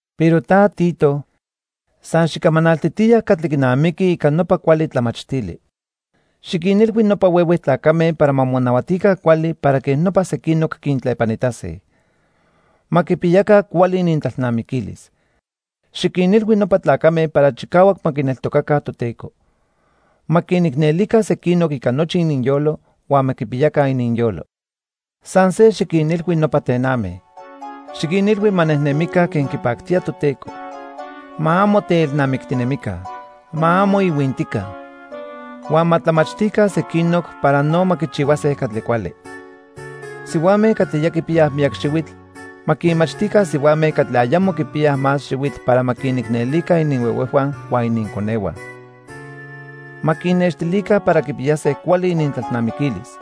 Pero ta Tito, san xicamanaltitiya catli quinamiqui ica nopa cuali tlamachtili. Xiquinilhui nopa huehue tlacame para ma monahuatica cuali para quej nopa sequinoc quintlepanitase. Ma quipiyaca cuali inintlalnamiquilis. Xiquinilhui nopa tlacame para chicahuac ma quineltocaca Toteco. Ma quinicnelica sequinoc ica nochi ininyolo huan ma quipiyaca ininyolo. San se xiquinilhui nopa tename. Xiquinilhui ma nejnemica quen quipactía Toteco. Ma amo teelnamictinemica. Ma amo ihuintica. Huan ma tlamachtica sequinoc para no ma quichihuase catli cuali. Sihuame catli ya quipiyaj miyac xihuitl ma quinmachtica sihuame catli ayamo quipiyaj más xihuitl para ma quinicnelica ininhuehuejhua huan ininconehua. Ma quinnextilica para quipiyase cuali inintlalnamiquilis.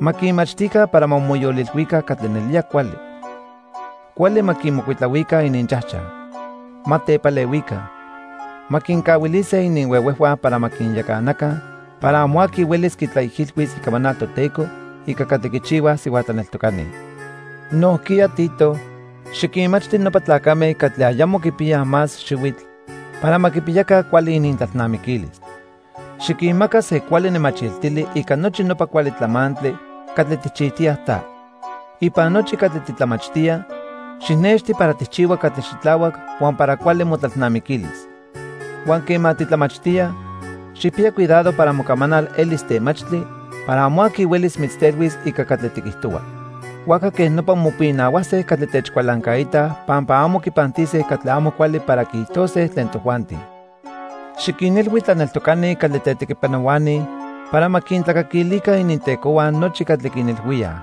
Ma quinmachtica para ma moyolilhuica catli nelía cuali. Cuali ma quimocuitlahuica ininchajchaj. Ma tepalehuica. Ma quincahuilise ininhuehuejhua para ma quinyacanaca para amo aqui huelis quitlaijilhuis icamanal Toteco ica catli quichihuaj sihua tlaneltocani. Nojquiya Tito, xiquinmachti nopa tlacame catli ayamo quipiyaj más xihuitl para ma quipiyaca cuali inintlalnamiquilis. Xiquinmaca se cuali nemachiltili ica nochi nopa cuali tlamantli catli tijchijtiya ta. Ipan nochi catli titlamachtía, xijnexti para tijchihua catli xitlahuac huan para cuali motlalnamiquilis. Huan quema titlamachtía, xijpiya cuidado para mocamanal elis temachtli para amo aqui huelis mitztelhuis ica catli tiquijtohua. Huajca quej nopa mopinahuase catli techcualancaitaj pampa amo quipantise catli amo cuali para quiijtose tlen tojuanti. Xiquinilhui tlaneltocani catli tetequipanohuani para ma quintlacaquilica inintecohua nochi catli quinilhuíaj.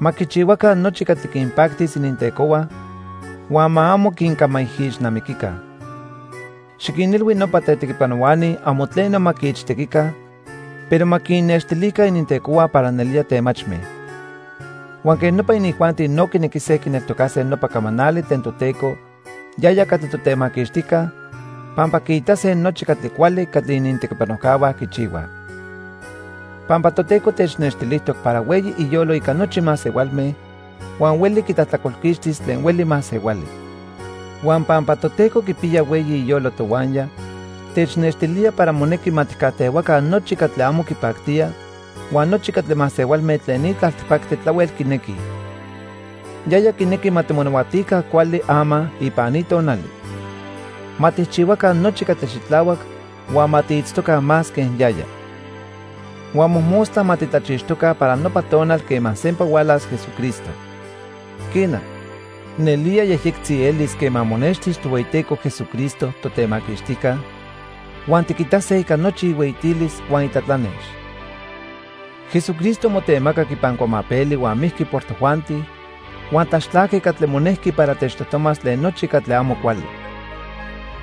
Ma quichihuaca nochi catli quinpactis inintecohua huan ma amo quincamaijixnamiquica. Xiquinilhui nopa tetequipanohuani amo tleno ma quiichtequica, pero ma quinnextilica inintecohua para nelía temachme. Huan quej nopa inijuanti no quinequise quineltocase nopa camanali tlen Toteco, yaya catli Totemaquixtijca, pampa quiitase nochi catli cuali catli inintequipanojcahua quichihuaj. Pampa Toteco technextilijtoc para hueyi iyolo ica nochi masehualme huan hueli quitlajtlacolquixtis tlen hueli masehuali. Huan pampa Toteco quipiya hueyi iyolo tohuaya, technextilía para monequi ma tijcajtehuaca nochi catli amo quipactía huan nochi catli masehualme tlen ni tlaltipactli tlahuel quinequij. Yaya quinequi ma timonahuatica cuali ama ipan ni tonali. Ma tijchihuaca nochi catli xitlahuac huan ma tiitztoca más quen yaya. Huan mojmostla ma titlachixtoca para nopa tonal quema sempa hualas Jesucristo. Quena, nelía yejyectzi elis quema monextis Tohueyiteco Jesucristo, Totemaquixtijca, huan tiquitase ica nochi ihueyitilis huan itlatlanex. Jesucristo motemacac ipan cuamapeli huan mijqui por tojuanti huan tlaxtlajqui catli monejqui para techtojtomas tlen nochi catli amo cuali.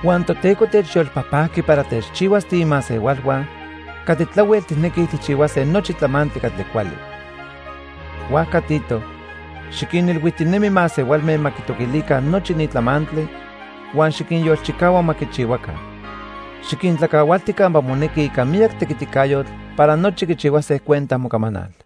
Huan Toteco techyolpajpajqui para techchihuas tiimasehualhua catli tlahuel tijnequij tijchihuase nochi tlamantli catli cuali. Huajca Tito, xiquinilhuijtinemi masehualme ma quitoquilica nochi ni tlamantli huan xiquinyolchicahua ma quichihuaca. Xiquintlacahualti campa monequi ica miyac tequiticayotl para nochi quichihuase cuenta mocamanal.